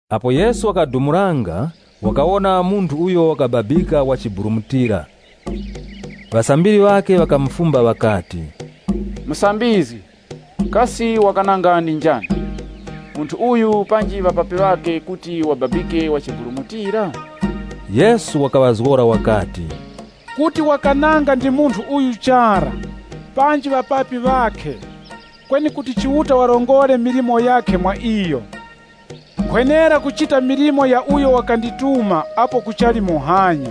Apo Yesu wakadumulanga, wakawona munthu uyo wakababika wachiburumutira. Ŵasambiri ŵakhe ŵakamufumba ŵakati, “Musambizgi, kasi wakananga ndi njani, munthu uyu, panji ŵapapi ŵakhe kuti wababike wachiburumutira?” Yesu wakaŵazgora wakati, “Kuti wakananga ndi munthu uyu chara, panji ŵapapi ŵakhe, kweni kuti Chiuta warongore milimo yakhe mwa iyo. Nkhwenera kuchita milimo ya uyo wakandituma apo kuchali muhanya.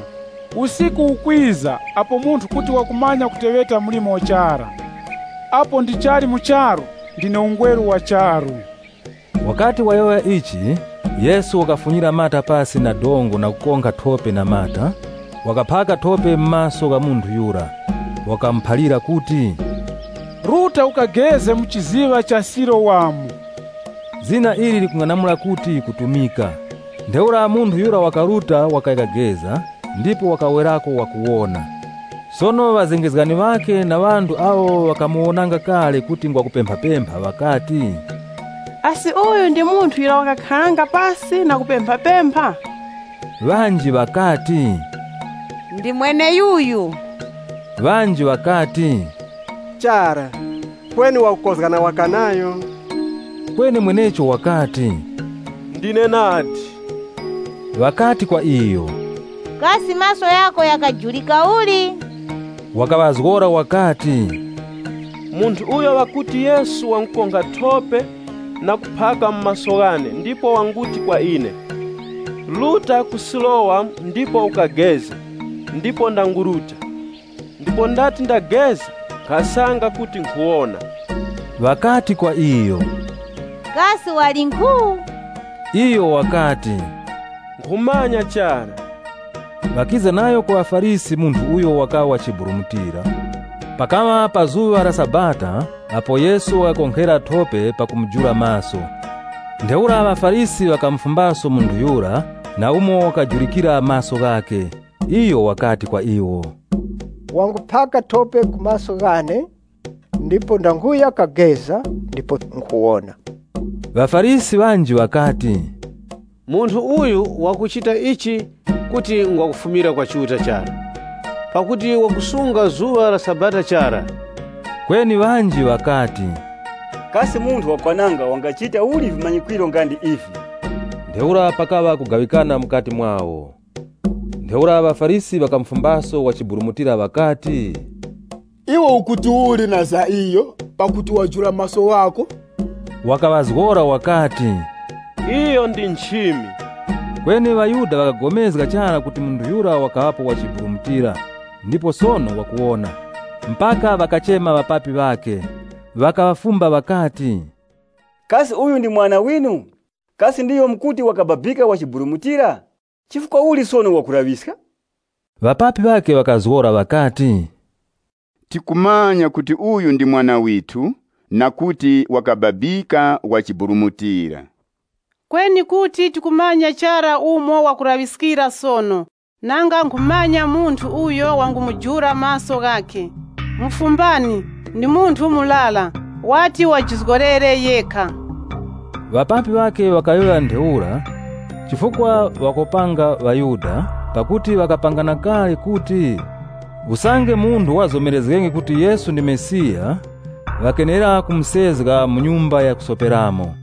Usiku ukwiza apo munthu kuti wakumanya kuteŵeta mlimo chara. Apo ndichali mu charu, ndine ungweru wa charu.” Wakati wayowoya ichi, Yesu wakafunyira mata pasi pa dongo na kukonkha thope na mata. Wakaphaka thope mu maso gha munthu yura. Wakamuphalira kuti, “Ruta ukageze mu chiziŵa cha Silowamu.” Zina ili likung'anamula kuti kutumika. Ntheura munthu yura wakaruta wakaya kageza ndipo wakawerako wakuwona. Sono ŵazengezgani ŵakhe na ŵanthu awo ŵakamuwonanga kale kuti ngwa kupemphapempha, ŵakati, “Asi uyu ndi munthu yura wakakharanga pasi na kupemphapempha?” Ŵanji ŵakati, “Ndi mweneyuyu.” Ŵanji ŵakati, “Chara, kweni wakukozgana waka nayo.” Kweni mwenecho wakati, “Ndine nadi.” Ŵakati kwa iyo, “Kasi maso ghako ghakajurika uli?” Wakaŵazgora wakati, “Munthu uyo ŵakuti Yesu wangukonkha thope na kuphaka mu maso ghane ndipo wanguti kwa ine, ‘Ruta ku Silowamu ndipo ukageze,’ ndipo ndanguruta. Ndipo ndati ndageza, nkhasanga kuti ndawona.” Ŵakati kwa iyo, “Kasi wali nkhu?” Iyo wakati, “Nkhumanya chara.” Ŵakiza nayo ku ŵaFarisi munthu uyo wakaŵa wachiburumutira. Pakaŵa pa zuŵa la Sabata apo Yesu wakakonkhera thope pakumujula maso. Ntheura ŵaFarisi ŵakamufumbaso munthu yura na umo wakajurikira maso ghakhe. Iyo wakati kwa iwo, “Wanguphaka thope ku maso ghane, ndipo ndanguya kageza, ndipo nkhuwona.” ŴaFarisi ŵanji ŵakati, “Munthu uyu wakuchita ichi kuti ngwa kufumira kwa Chiuta chara. Pakuti wakusunga zuŵa la Sabata chara.” Kweni ŵanji ŵakati, “Kasi munthu wakwananga wangachita uli vimanyikwiro nga ndi ivi? Ntheura pakaŵa kugaŵikana mukati mwawo.” Ntheura ŵaFarisi ŵakamufumbaso wachiburumutira ŵakati, “Iwe ukuti uli na za iyo, pakuti wajula maso ghako?” Wakaŵazgora wakati, “Iyo ndi nchimi.” Kweni ŵaYuda ŵakapulikana chara kuti munthu yura wakaŵapo wachiburumutira ndipo sono wakuwona, mpaka ŵakachema ŵapapi ŵakhe. Ŵakaŵafumba ŵakati, “Kasi uyu ndi mwana winu? Kasi ndiyo mukuti wakababika wachiburumutira? Chifukwa uli sono wakulaŵiska?” Ŵapapi ŵakhe ŵakaŵazgora ŵakati, “Tikumanya kuti uyu ndi mwana withu na kuti wakababika wachiburumutira. Kweni kuti tikumanya chara umo wakulaŵiskira sono, nanga nkhumanya munthu uyo wangumujula maso ghakhe. Mufumbani, ndi munthu murara, wati wajizgorere yekha.” Ŵapapi ŵakhe ŵakayowoya ntheura, chifukwa ŵakopanga ŵaYuda pakuti ŵakapangana kale kuti, usange munthu wazomerezgenge kuti Yesu ndi Mesiya, ŵakenera kumusezga mu nyumba ya kusoperamo.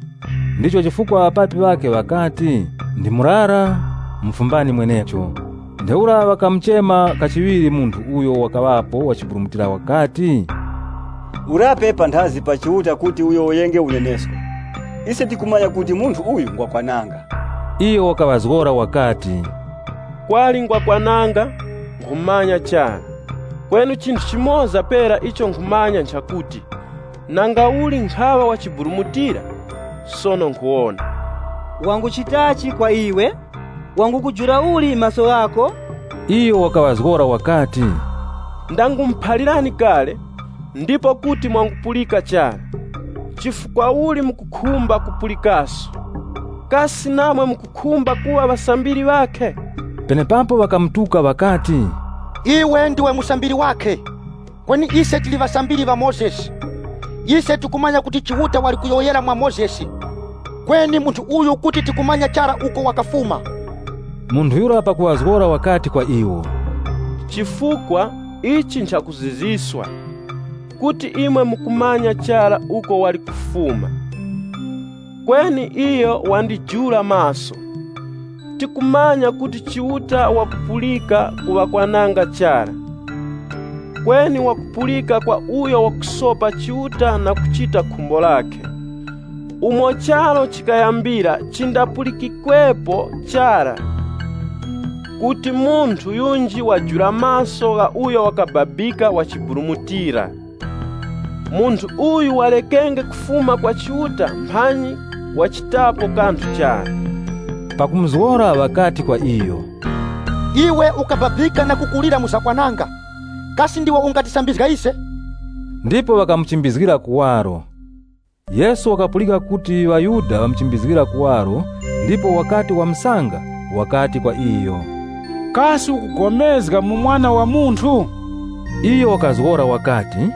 Ndicho chifukwa ŵapapi ŵakhe ŵakati “Ndi murara, mufumbani mwenecho.” Ntheura ŵakamuchema kachiŵiri munthu uyo wakaŵapo wachiburumutira, ŵakati, “Urape panthazi pa Chiuta kuti uyowoyenge unenesko. Ise tikumanya kuti munthu uyu ngwakwananga.” Iyo wakaŵazgora wakati, “Kwali ngwakwananga, nkhumanya chara. Kweni chinthu chimoza pera icho nkhumanya nchakuti, nangauli nkhaŵa wachiburumutira, sono nkhuwona.” “Wanguchitachi kwa iwe? Wangukujula uli maso ghako?” Iyo wakaŵazgora wakati, “Ndangumuphalirani kale ndipo kuti mwangupulika chara. Chifukwa uli mukukhumba kupulikaso? Kasi namwe mukukhumba kuŵa ŵasambiri ŵakhe?” Penepapo ŵakamutuka ŵakati, “Iwe ndiwe musambiri wakhe, kweni ise tili ŵasambiri ŵa Mozesi. Ise tikumanya kuti Chiuta wali kuyowoyera mwa Mozesi, kweni munthu uyu kuti tikumanya chara uko wakafuma.” Munthu yura pakuŵazgora wakati kwa iwo, “Chifukwa, ichi nchakuzizwiska, kuti imwe mukumanya chara uko wali kufuma, kweni iyo wandijula maso! Tikumanya kuti Chiuta wakupulika ku ŵakwananga chara, kweni wakupulika kwa uyo wakusopa Chiuta na kuchita khumbo lakhe. Umo charu chikayambira chindapulikwikepo chara kuti munthu yunji wajula maso gha uyo wakababika wachiburumutira. Munthu uyu warekenge kufuma kwa Chiuta mphanyi wachitapo kanthu chara.” Pakumuzgora ŵakati kwa iyo, “Iwe ukababika na kukulira mu zakwananga. Kasi ndiwe ungatisambizga ise!” Ndipo wakamuchimbizgira kuwaro. Yesu wakapulika kuti ŵaYuda ŵamuchimbizgira kuwaro ndipo wakati wamusanga, wakati kwa iyo, “Kasi ukupulikana mwa Mwana wa Munthu?” Iyo wakazgora wakati,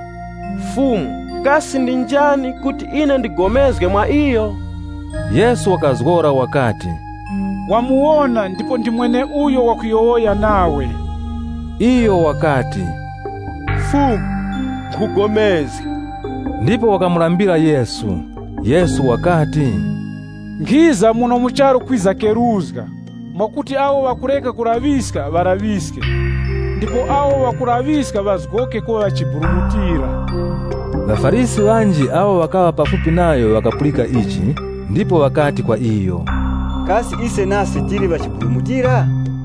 “Fumu, kasi ndi njani, kuti ine ndipulikane mwa iyo?” Yesu wakazgora wakati, “Wamuwona ndipo ndi mweneuyo wakuyowoya nawe.” Iyo wakati, “Fumu, nkhupulikana,” ndipo wakamulambira Yesu. Yesu wakati, “Nkhiza muno mu charu kwiza keruzga, mwakuti awo ŵakureka kulaŵiska ŵalaŵiske, ndipo awo ŵakulaŵiska ŵazgoke kuŵa ŵachiburumutira.” ŴaFarisi ŵanji awo ŵakaŵa pafupi nayo ŵakapulika ichi ndipo ŵakati kwa iyo, “Kasi ise nase tili ŵachiburumutira?”